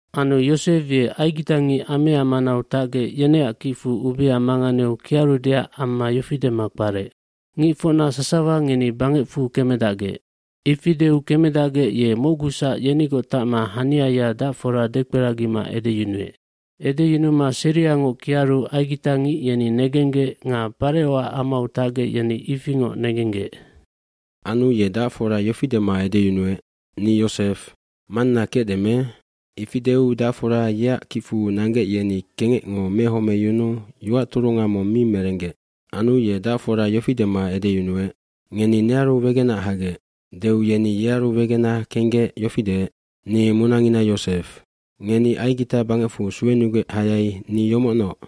aAnu Yosef ye aigitangic amea manau tacgec yeneac kicfu ubia manganeu kiarudeac amma yofi dema kparec, “Ngicfocna sasawa ngeni bangecfu kemedacgec.” Ifi deu kemedacgec ye mocgusac yenigoc tacma haniaya dacfora dekperagima edeyunuec. Edeyunuma seriangoc kiaru aigitangic yeni negenggec nga Parecoac amau tacgec yeni ifingoc negenggec. bAnu ye dacfora yofi dema edeyunuec, “Ni Yosef, manna kecde me?” Ifi deu dacfora yeac kicfu nanggec yeni kengecngo mehomeyunuu yoac turunga mong mi merenggec. Anu ye dacfora yofi dema edeyunuec, “Ngeni nearu wegenac hagec.” Deu yeni yearu wegenac kenggec yofi deec, “Ni munangina Yosef. Ngeni Aigita bangecfu suenugec hayai ni yomocnoc.”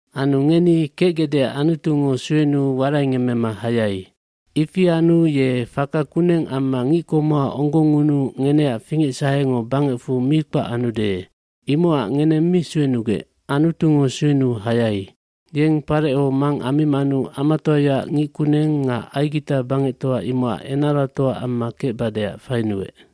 Anu ngeni kecgecdeac Anutungo suenuu waraingemmema hayai. Ifi anu ye faka kuneng amma ngickomoha onggongngunuu ngeneac fingecsahengo bangecfu mi kpac anude. Imocac ngeneng mi suenugec, Anutungo suenuu hayai. Yeng Pareco mang ammimanu amatoayaac ngic kuneng nga Aigita bangectoa imocac enaratoa amma kecbadeac fainuec.”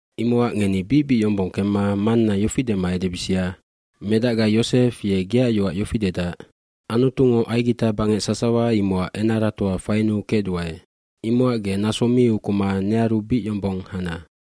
dImocac ngeni bicbic yombong kemma manna yofi dema edebisia, “Medacga Yosef ye geac yoac yofi dedac, ‘Anutungo Aigita bangec sasawa imocac enaratoa fainuu kecduae. Imocac ge naso mi ukuma nearu bic yombong hana.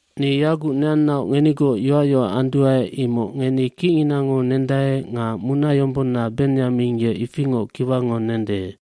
“Ni yaguc neannaoc ngenigoc yoacyoac anduae imoc ngeni kicnginango nendae nga munayombonna Benyamin ye ifingoc kiwango nende.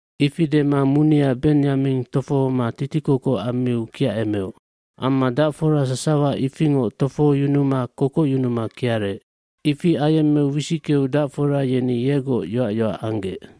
Ifi dema munia Benyamin tofohoma titikokoc ammiu kiacemeoc. Amma dacfora sasawa ifingoc tofohoyunuma kokocyunuma kiarec. Ifi ayemmeu wisickeu dacfora yeni yegoc yoacyoac anggec.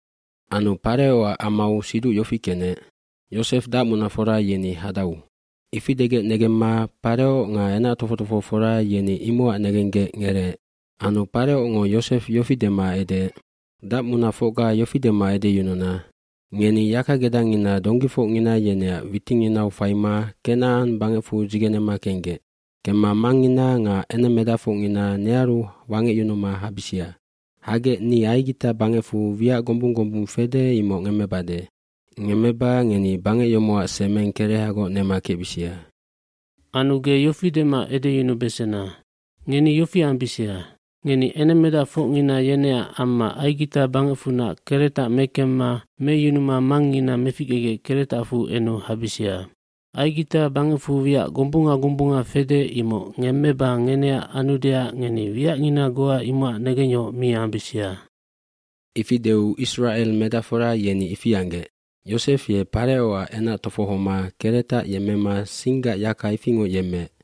Anu Parecoac amau siduc yofi kenec, “Yosef dacmunafora yeni hadau.” Ifi degec negemma Pareco nga enac tofoc tofohofora yeni imocac negenggec ngereec. Anu Parecongo Yosef yofi dema edeec, “Dacmunafocga yofi dema edeyununa, ‘Ngeni yakagedangngina donggifocngina yeneac witinginau faima Kenacan bangecfu dzigenema kenggec. Kemma mangngina nga enengmedacfocngina nearu wangecyunuma habisia. Hagec ni Aigita bangecfu wiac gombung gombung fede imoc ngemmebade. Ngemmeba ngeni bangec yomocac semeng kerehagoc nema kecbisia.’ Anu ge yofi dema edeyunubesena, ‘Ngeni yofi ambisia. Ngeni enengmedacfocngina yeneac amma Aigita bangecfunac keretac mekemma meyunuma mangngina meficgegec keretafu enu habisia. Aigita bangecfu wiac gombunga gombunga fede imoc ngemmeba ngeneac anudeac ngeni wiacngina goa imocac negengyohoc mi ambisia.’” Ifi deu Isracel medacfora yeni ifi anggec. Yosef ye Parecoac enac tofohoma keretac yemmema singgac yaka ifingoc yemmeec.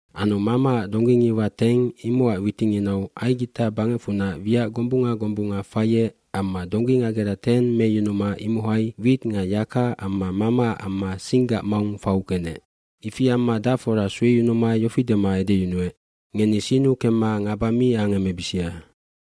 Anu mamaac donggingiwa teng imocac witinginau Aigita bangecfunac wiac gombunga gombunga faiec amma donggingagera teng meyunuma imohai wit nga yaka amma mamaac amma singgac maung fau kenec. Ifi amma dacfora sueyunuma yofi dema edeyunuec, “Ngeni sinnu kemma ngaba mi angemebisia.”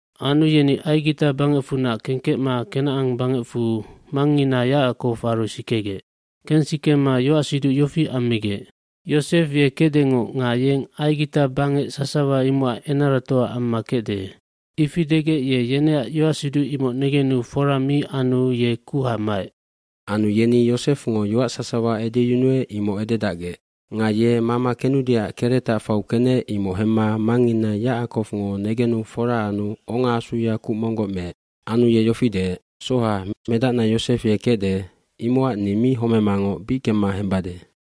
Anu yeni Aigita bangecfunac kengkecma Kenacan bangecfu mangngina Yacakowaru sikegec. Kensikema yoacsiduc yofi ammigec, “Yosef ye kecdengoc nga yeng Aigita bangec sasawa imocac enaratoa amma kecde.” Ifi degec ye yeneac yoacsiduc imoc negenu fora mi anu ye kuha maec. fAnu yeni Yosefngo yoac sasawa edeyunuec imoc ededacgec. Nga ye mama kenudeac keretac fau kenec imoc hemma mangngina Yacakowngo negenu fora anu ongaasuya kuc monggoc meec. gAnu ye yofi deec, “Soha, medacna Yosef ye kecde imocac ni mi homemangoc bic kemma hembade.”